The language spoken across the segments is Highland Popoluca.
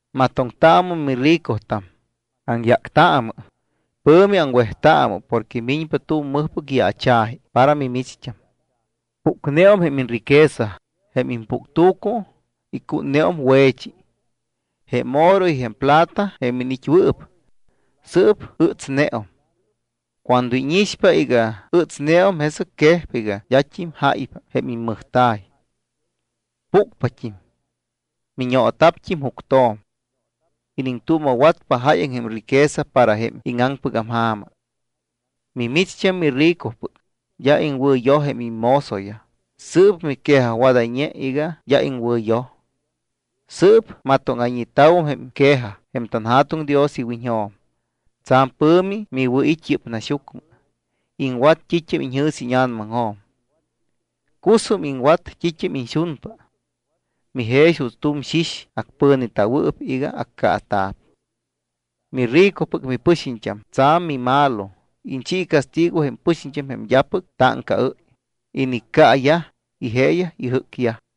Matoŋtaamɨ miricotam, aŋyáctaamɨ, pɨ̱mi aŋwejtaamɨ porque miñpa tu̱m mɨjpɨc yaacha̱ji para mimicht́am. Pucneum jém iñriquesa, jém impuctu̱cu icútneum we̱chi. Jém oro y jém plata jém iniit́wɨɨp, sɨɨp ɨtsneum. Cuando íñixpa iga ɨtsneum, jesɨc quejpa iga d́at́im jáypa jém immɨjta̱y. Pucpat́im. Miñoota̱pt́im juctjo̱m. Iniŋtuuma̱watpa jáyaŋ jém riqueza para jém íŋaŋpɨgam ja̱ma. Mimicht́am miricopɨc, d́a iŋwɨ̱yoj jém immozoyaj, sɨɨp miquejajwadayñe iga d́a iŋwɨ̱yoj. Sɨɨp matóŋa̱ñeta̱wum jém quejaj jém tanJa̱tuŋ Dios iwiñjo̱m. Tsa̱m pɨ̱mi miwɨ̱it́ yɨ́p naxyucmɨ. Iŋwat t́it́am iñjɨ̱s íña̱namaŋjo̱m. Cusum iŋwat t́it́am iñxunpa. Mijex juuts tu̱m xix acpɨ̱neta̱wɨɨp iga accaata̱p. Miricopɨc mipɨxiñt́am tsa̱m mimalo. Iñchi castigo jém pɨxiñt́am jém d́apɨc táŋcaɨ́y, iniccaayaj, y jeeyaj ijɨ́cyaj.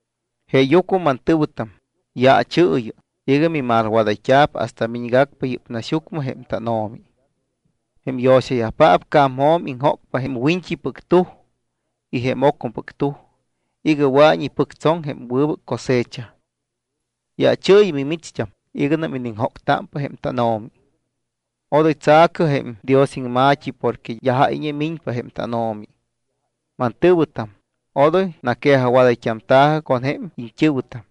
Jeeyucmɨ, mantɨ̱wɨtam, yaachɨɨyɨ iga mimalwadayt́a̱p hasta miñgacpa yɨ́p naxyucmɨ jém tánO̱mi. Jém yo̱xayajpaap ca̱mjo̱m iŋjócpa jém wiñt́ipɨc tuj y jém ocmɨpɨc tuj iga wɨa̱iñ ipɨctsoŋ jém wɨbɨc cosecha. Yaachɨɨyɨ, mimicht́am, iganam iniŋjóctámpa jém tánO̱mi. Odoy tsa̱cɨ jém Dios iŋma̱t́i porque d́a jáyñe miñpa jém tánO̱mi. Mantɨ̱wɨtam, odoy naquejajwadayt́amta̱ji con jém iñt́ɨ̱wɨtam,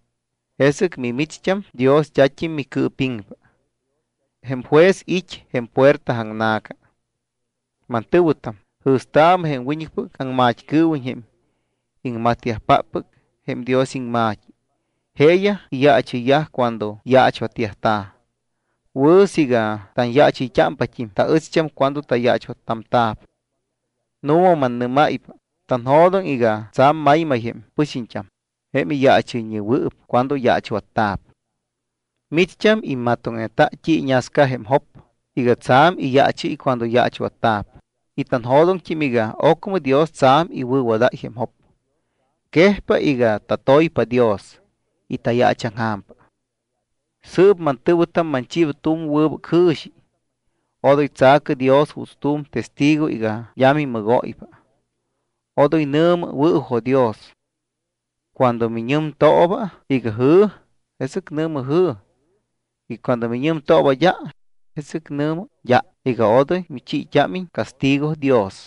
jesɨc mimicht́am Dios d́at́im micɨɨpiŋpa. Jém juez it́ jém puerta aŋna̱ca. Mantɨ̱wɨtam, jɨ̱staamɨ jém wiñɨcpɨc aŋmat́cɨɨwiñ jém iŋmatyajpáppɨc jém Dios iŋma̱t́i. Jeeyaj iyaachɨyyaj cuando yaachwatyajta̱. Wɨ̱ siiga tanyaachɨyt́ámpat́im taɨcht́am cuando tayaachwattamta̱p. Nu̱ma mannɨ́máypa, tanjo̱doŋ iga tsa̱m maymay jém pɨxiñt́am jém iyaachɨyñewɨɨp cuando yaachwatta̱p. Micht́am immatoŋneta t́i iñasca jém Job iga tsa̱m iyaachɨ́y cuando yaachwatta̱p y tanjo̱doŋt́im iga ocmɨ Dios tsa̱m iwɨ̱wadáy jém Job. Quejpa iga tatoypa Dios y tayaachaŋja̱mpa. Y sɨɨp mantɨ̱wɨtam, manchiiba tu̱m wɨbɨc jɨ̱xi. Odoy tsa̱cɨ Dios juuts tu̱m testigo iga d́a mimɨgóypa. Odoy nɨ̱mɨ: “Wɨ̱jo̱dios.” Cuando miñɨmtooba iga: “Jɨ̱”, jesɨc nɨ̱mɨ “Jɨ̱.” Cuando miñɨmtooba: “D́a”, jesɨc nɨ̱mɨ “d́a” iga odoy michiit́ámiñ castigo Dios.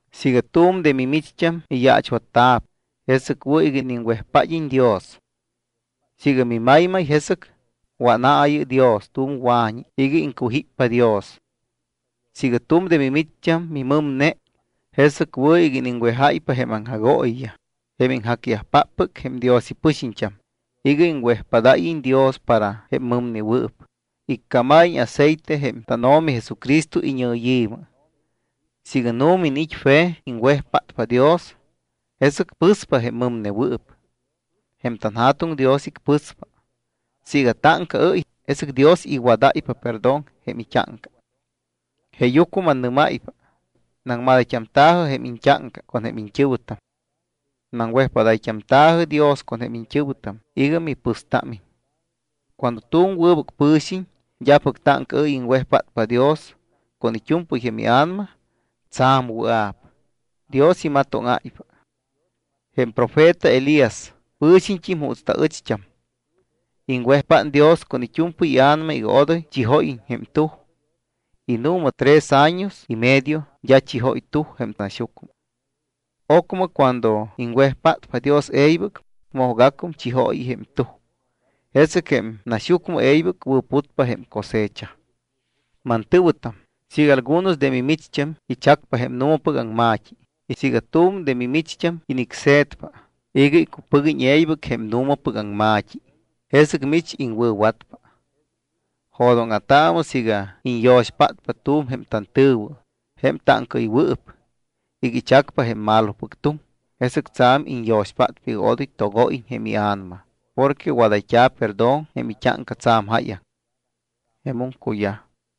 Siiga tu̱m de mimicht́am miyaachwatta̱p, jesɨc wɨ̱ iga iniŋwejpád́iñ Dios. Siiga mimaymay, jesɨc wánaayɨ Dios tu̱m wa̱ñi iga iŋcujíppa Dios. Siiga tu̱m de mimicht́am mimɨmne, jesɨc wɨ̱ iga iŋwejáypa jém aŋjagooyiyaj, jém iŋjacyajpáppɨc jém Dios ipɨxiñt́am, iga iŋwejpádayyajiñ Dios para jém mɨmnewɨɨp, iccámayyajiñ aceite jém tánO̱mi Jesucristo iñɨyi̱mɨ. Siiga nu̱ma iniit́ fe cuando iŋwejpátpa Dios, jesɨc pɨspa jém mɨmnewɨɨp. Jém tanJa̱tuŋ Dios icpɨspa. Siiga táŋcaɨ́y, jesɨc Dios iwadáypa perdón jém it́áŋca. Jeeyucmɨ mannɨ́máypa, Naŋmadayt́amta̱jɨ jém iñt́áŋca con jém iñt́ɨ̱wɨtam. Naŋwejpádayt́amta̱jɨ Dios con jém iñt́ɨ̱wɨtam iga mipɨstámiñ. Cuando tu̱m wɨbɨc pɨ̱xiñ, d́apɨc táŋcaɨ́y, iŋwejpátpa Dios con it́u̱mpɨy jém ia̱nama, tsa̱m wɨa̱p, Dios imatóŋáypa. Jém profeta Elias pɨ̱xiñt́im juutst́im taɨcht́am. Iŋwejpát Dios con it́u̱mpɨy ia̱nama iga odoy chijóyiñ jém tuj. Y nu̱ma tres años y medio d́a chijóy tuj jém naxyucmɨ. Ocmɨ cuando iŋwejpátpa Dios e̱ybɨc, mojgacum chióy jém tuj. Jesɨc jém naxyucmɨ e̱ybɨc wɨ̱putpa jém cosecha. Mantɨ̱wɨtam, siiga algunos de mimicht́am ichacpa jém nu̱mapɨc aŋma̱t́i y siiga tu̱m de mimicht́am inicse̱tpa iga icupɨguiñ e̱ybɨc jém nu̱mapɨc aŋma̱t́i, jesɨc mich iŋwɨ̱watpa. Jo̱dóŋa̱taamɨ siiga iñyo̱xpátpa tu̱m jém tantɨ̱wɨ, jém táŋcaɨywɨɨp, iga ichacpa jém malopɨc tuŋ, jesɨc tsa̱m iñyo̱xpátpa iga odoy togóyiñ jém ia̱nama porque wadayt́a̱ perdón jém it́áŋca tsa̱m jáyaŋ. Jemum cuyaj.